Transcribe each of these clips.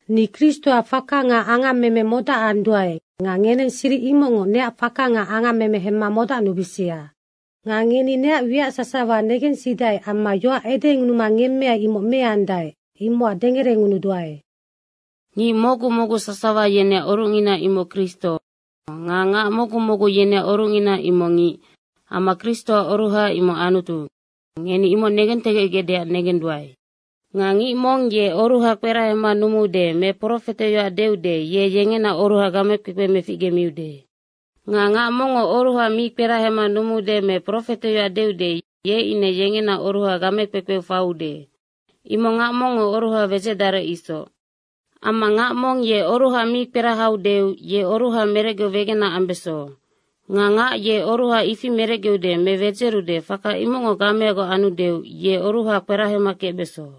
Ni Kristoac faka nga angammeme modacanduae nga ngeneng siric imocngoc neac faka nga angammeme hemma modacnubisia. Nga ngeni neac wiac sasawa negensidae amma yoac edengunuma ngemmeai, imoc meandae, imocac dengerengunuduae. Ngic mocgu mocgu sasawa yeneac orucngina imoc Kristo nga ngac mocgu mocgu yeneac orucngina imoc ngic amma Kristoac oruha imoc Anutu, ngeni imoc negentegecgecdeac negenduae. Nga ngic mong ye oruha kperahema numuude me profeteyoac deude, ye yengena oruha gamekpekpe meficgemiude. Nga ngac mongngo oruha mi kperahema numuude me profeteyoac deude, ye ine yengena oruha gamekpekpeu faiude. Imoc ngac mongngo oruha wedzecdarec isoc. Amma ngac mong ye oruha mi kperahaudeu ye oruha merecgeu wegena ambeso. Nga ngac ye oruha ifi merecgeude me wedzerude faka imocngo gameagoc andeu ye oruha kperahema kecbeso.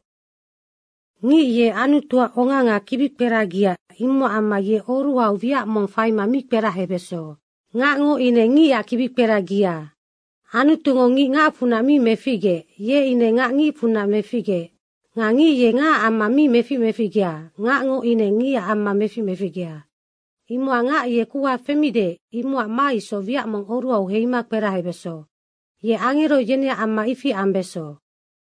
Ngic ye Anutuac onga nga kibikperagia, imocac amma ye oruhau wiac mong faima mi kperahebeso. Ngacngo ine ngicac kibikperagia. Anutungo ngic ngacfunac mi meficgeec, ye ine ngac ngicfunac meficgeec. Nga ngic ye ngacac amma mi mefic meficgea, ngacngo ine ngicac amma mefic meficgea. Imocac ngac ye kuha femide imocac ma isoc wiac mong oruhau heima kperahebeso. Ye angero yeneac amma ifi ambeso.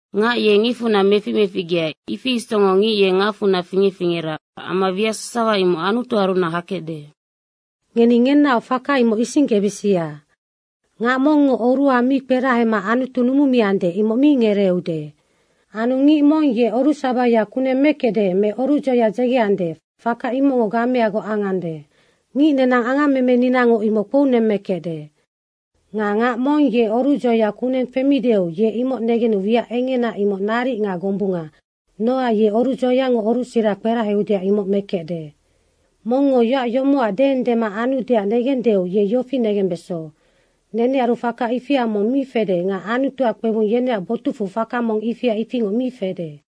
Ngac ye ngicfunac mefic meficgea, ifi isocngoc ngic ye ngacfunac fingec fingera amma wiac sasawa imoc Anutuarunac hakecde. Ngeni ngenaoc faka imoc isinggebisia. Ngac mongngo oruha mi kperahema Anutu numumiande, imoc mi ngereeude. Anu ngic mong ye orucsabaya kuneng mekecde me orucdzoya dzegeande, faka imocngo gameagoc angande. Ngic nenang angammemeninango imoc kpounemmekecde. Nga ngac mong ye orucdzoya kuneng femideu ye imoc negenu wiac engena, imoc naric nga gombunga, nocac ye orucdzoyango orucsira kperaheudeac imoc mekecde. Mongngo yoac yomocac deendema anudeac negendeu ye yofi negembeso, nenearu faka ifia mong mi fede nga Anutuac kpebung yeneac botucfu faka mong ifia ifingoc mi fede.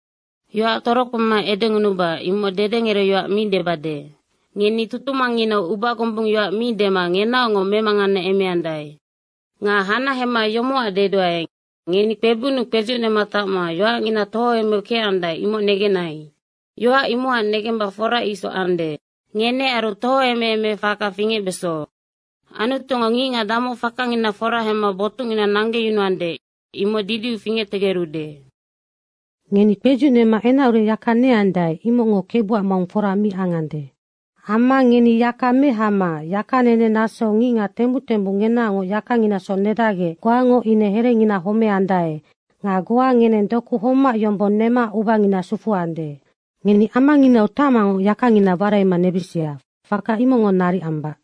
Yoac torokpema edengunuba, imoc dedengerecyoac mi debade. Ngeni tutumangnginau ubagombung yoac mi dema ngenaocngoc memanganeemeandae. Nga hanahema yomocac deduae, ngeni kpebunnu kpedzucnema tacma yoacngina tohoemeu kecandae, imoc negenai. Yoac imocac negemba fora isoc ande. Ngenearu tohoemeemefaka fingecbeso. Anutungo ngicngac damoc fakangina fora hemma botucnginau nanggeyunuande, imoc didiu fingectegerude. Ngeni kpedzucnema enacurec yaka neandae, imocngo Kebuac maung fora mi angande. Amma ngeni yaka mehama yakanene nasou ngicngac tembuc tembuc ngenaoc yakanginasoc nedacgec goango ine herenginaac homeandae nga goa ngeneng doku homac yombong nema ubangina sufuande. Ngeni amanginau tacmangoc yakangina waraima nebisia, faka imocngo naric ambac.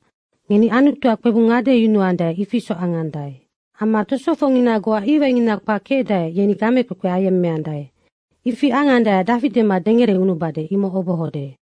Ngeni Anutuac kpebung ngadeyunuandae, ifi isoc angandae. Amma tosofocngina goa iwaingina kpac kecdae, yeni gamekpekpe ayemmeandae. Ifi angandaeac dafi dema dengerengunubade, imoc obohode.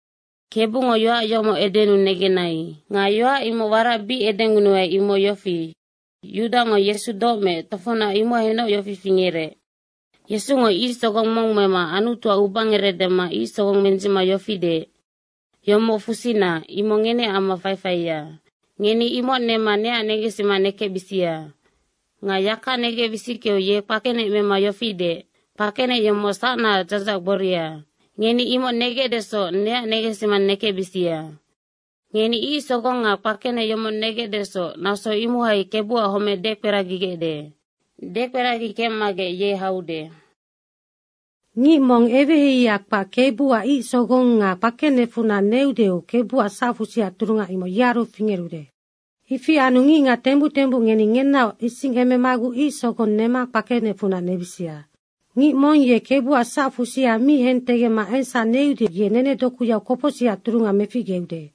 Kebungo yoac yomoc edenuu negenai. Nga yoac imoc warac bic edengunuai, imoc yofi, Yudango Yesu doc meec, tofocnac imohainoc yofi fingerec, Yesungo ic sogong mong mema Anutuac ubangerec dema ic sogong mendzicma yofi deec, “Yomoc fusina, imoc ngeneac amma faifaia. Ngeni imoc nema neac negensima nekecbisia.” Nga yaka negec wisickeu ye kpakenec mema yofi deec, “Kpakenec yomoc sacnaac dzadzahac gboria. Ngeni imoc negecdesoc neac negensima nekecbisia.” Ngeni ic sogong nga kpakenec yomoc negecdesoc, naso imohai Kebuac homec dekperagigecde. Dekperagi kecmagec ye haude. Ngic mong eweheiheia kpac Kebuac ic sogong nga kpakenecfunac neudeu Kebuac sacfusiac turunga imoc yearu fingerude. Ifi anu ngicngac tembuc tembuc ngeni ngenaoc isingememaguc ic sogong nema kpakenecfunac nebisia. Ngic mong ye Kebuac sacfusia mi hentegecma engsac neude, ye nenedokuyau kopocsicac turunga meficgemiude.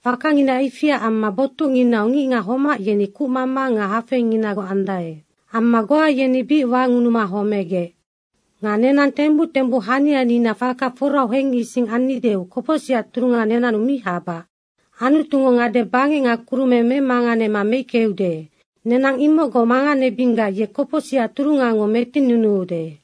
Fakangina ifiac amma botucnginau ngicngac homac yeni kucmama nga hafeinginagoc andae. Amma goa yeni bic wangunuma homegec. Nga nenang tembuc tembuc hanianina faka forau hengising annideu kopocsicac turunga nenannu mi habac. Anutungo ngade bangec nga kurumeng memanganema meickeude, nenang imocgoc manganebinggac ye kopocsicac turungango metinnunuude.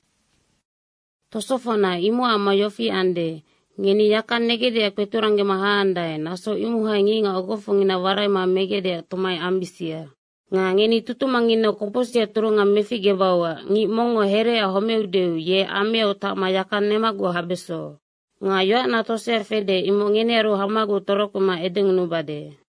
Tosofocna, imocac amma yofi ande, ngeni yaka negecdeac kpeturanggema haandae, naso imohai ngicngac ogofocngina waraima megecdeac tomai ambisia. Nga ngeni tutumangnginau kopocsicac turunga meficgebauac ngic mongngo hereaac homeudeu ye ameau tacma yaka nemaguc habeso. Nga yoacna tosea fede, imoc ngenearu hamaguc torokpema edengunubade.